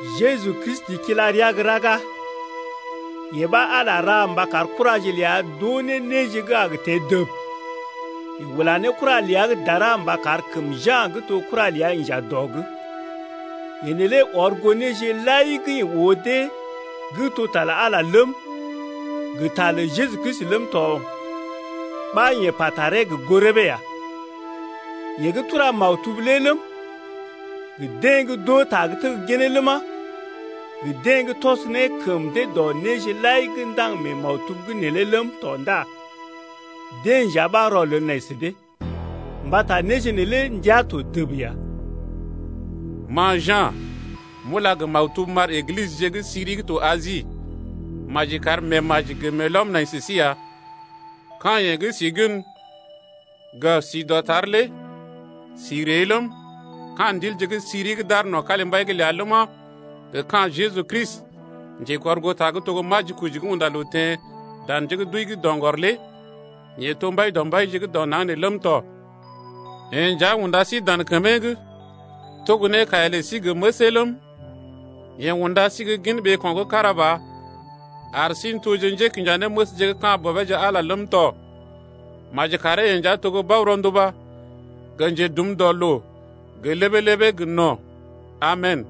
Jeju Kristi kila rəa gə́ raga. Yee ɓa Ala ra mba kar kuraje ləa d’oo ne néje gə́ a gə teḛ dəb. Yeḛ ula kura ləa gə́ dara mba kar kəm Ja̰ gə́ to kura ləa inja dɔ’g. Yee neelé ɔr goo néje lai gə́ yeḛ oo gə́ ta lə Ala ləm, gə ta lə Jeju Kristi ləm tɔ ɓa yeḛ pa taree gə goo rəbee ya. Yeḛ gə́ tura maktub lé ləm, gə deḛ gə́ d’oo ta gə́ tegginee ləma, gə deḛ gə́ tɔs ne kəm dee dɔ néje lai gə́ ndaŋg mee maktub’g neelé ləm tɔ ndá deḛ nja ɓa rɔlel nai sə dee. Mbata néje neelé ndəa to dəb ya. Ma Ja̰ m’ula gə maktub m’ar Eglisəje gə́ siri gə́ to Asi. Maji kar meemaji gə meelɔm nai sə sí ya, ka̰ yeḛ gə́ si gən, gə si dɔtar lé, si ree ləm, ka̰ ndilje gə́ siri gə́ d’aar no̰ kalimbai’g ləa ləma, gə ka̰ Jeju Kristi Njekɔrgoota gə́ to Majikoji gə́ unda loo teḛ dan njé gə́ d’wəi’g doŋgɔr lé yeḛ to Mbai dɔ mbaije gə́ dɔ naŋg nee ləm tɔ. Yeḛ nja unda sí dan kəmee’g, togo ne kaiya lə sí gə məsee ləm, yeḛ unda sí gə́ gin ɓeeko̰ gə́ kára ba ar sí n’tojee njékinjanéməsje gə́ ka̰ Bɔbeeje Ala ləm tɔ. Maji karee yeḛ nja to Bao-ronduba gə Njedum dɔ loo gə ləbee-ləbee gə no̰. Amen.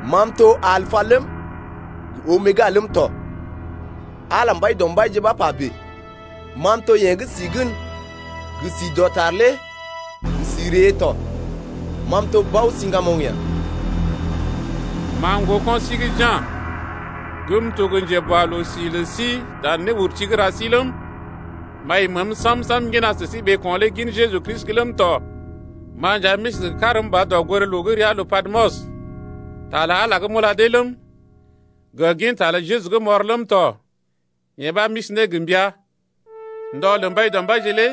Ma m’to Alpa ləm, gə Omega ləm tɔ, Ala Mbaidɔmbaije ɓa pa bèe. Ma m’to yeḛ gə́ si gən gə si dɔtar lé ləm gə si ree ləm tɔ. Ma m’to Bao-siŋgamoŋ ya. Ma, ŋgoko̰ si gə́ Ja̰ m’to gə́ njeboaloo-si lə si dan néurti’d gə́ ra si ləm, m’ai məəm sam-sam m’ŋgina sə sí ɓeeko̰ lé gin Jeju’g ləm tɔ. Ma nja m’isi gə karm ba dɔgoré-loo gə́ ria ləa lə Patmos. Ta lə Ala gə́ m’ula dee ləm, gə ginta lə Jeju gə́ m’ɔr ləm tɔ lé yee ɓa m’isi ne gə mbəa. Ndɔ lə Mbaidɔmbaije lé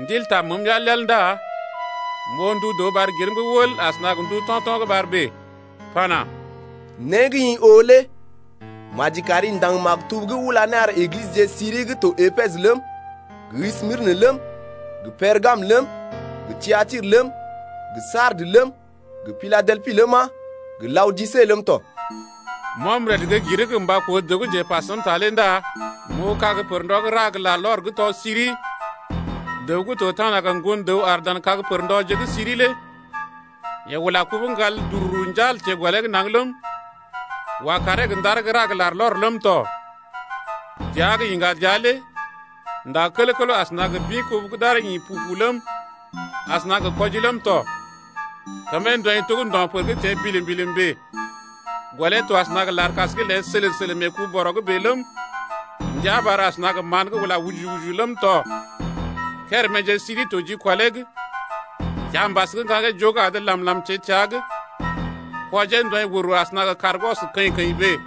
Ndil taa məəm yal-yal ndá m’oo ndu dəw ɓar girm’g wəl asəna gə ndu to̰to̰ gə́ ɓar bèe, pana: Né gə́ ma m’oo lé maji kam ndaŋg maktub’g m’ula ne m’ar Eglisəje gə́ siri gə́ to Epesə ləm, gə Smirnə ləm, gə Pergamə ləm, gə Tiatirə ləm, gə Sardes ləm, gə Piladelpi ləma, gə laodise ləm tɔ. M’ɔm rəd gə́ girm’g gə mba koo dəw gə́ njepa səm ta lé ndá m’oo kag pər-ndɔ gə́ ra gə larlɔr gə́ tɔ siri, Dəw gə́ to tana gə ŋgon-dəw bèe aar dan kag pər-ndɔje’d gə́ siri lé. Yeḛ ula kubu gə́ ŋgal dururu njal teḛ gɔlee’g naŋg ləm, wa kaaree gə ndar gə́ ra gə larlɔr ləm tɔ. Dəa gə yiŋga dəa lé nda kələw-kələw asəna gə bḭ-kubu gə́ d’aree ḭ pu-pu ləm, asəna gə kɔji ləm tɔ. Kəmee ndɔḭ to gə́ ndo̰-pər gə́ teḛ bilim-bilim bèe. Gɔlee to asəna gə larkas gə́ léḛ sələlə-sələlə mee ku-bɔrɔ’g bèe ləm, ndia ɓar asəna gə mán-béləm gə́ ula ujuju-ujuju ləm tɔ. Kéréméje siri to jikɔlee’g. Kiambas gə́ ŋgaŋgee joo gə́ adə làm-làm teḛ təa’g. Kwɔjee ndɔḭ wər-wər asəna gə kàr gə́ ɔs kəḭ-kəḭ bèe.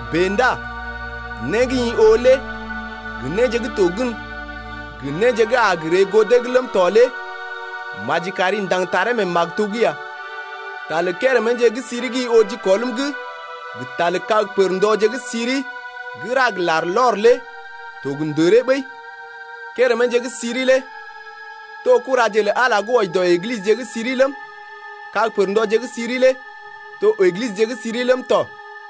Bèe ndá né gə́ ma m’oo lé gə néje gə́ to gən, gə néje gə́ a ree goo dee’g ləm tɔ lé maji kam ndaŋg taree mee maktub’g ya. Ta lə kéréméje gə́ siri gə́ ma m’oo jikɔl neḛ’g gə ta lə kag pər-ndɔje gə́ siri gə́ ra gə larlɔr lé to gə ndəree ɓəi. Kéréméje gə́ siri lé to kuraje lə Ala gə́ wɔji dɔ Eglisəje gə́ siri ləm, kag pər-ndɔje gə́ siri lé to Eglisəje gə́ siri ləm tɔ.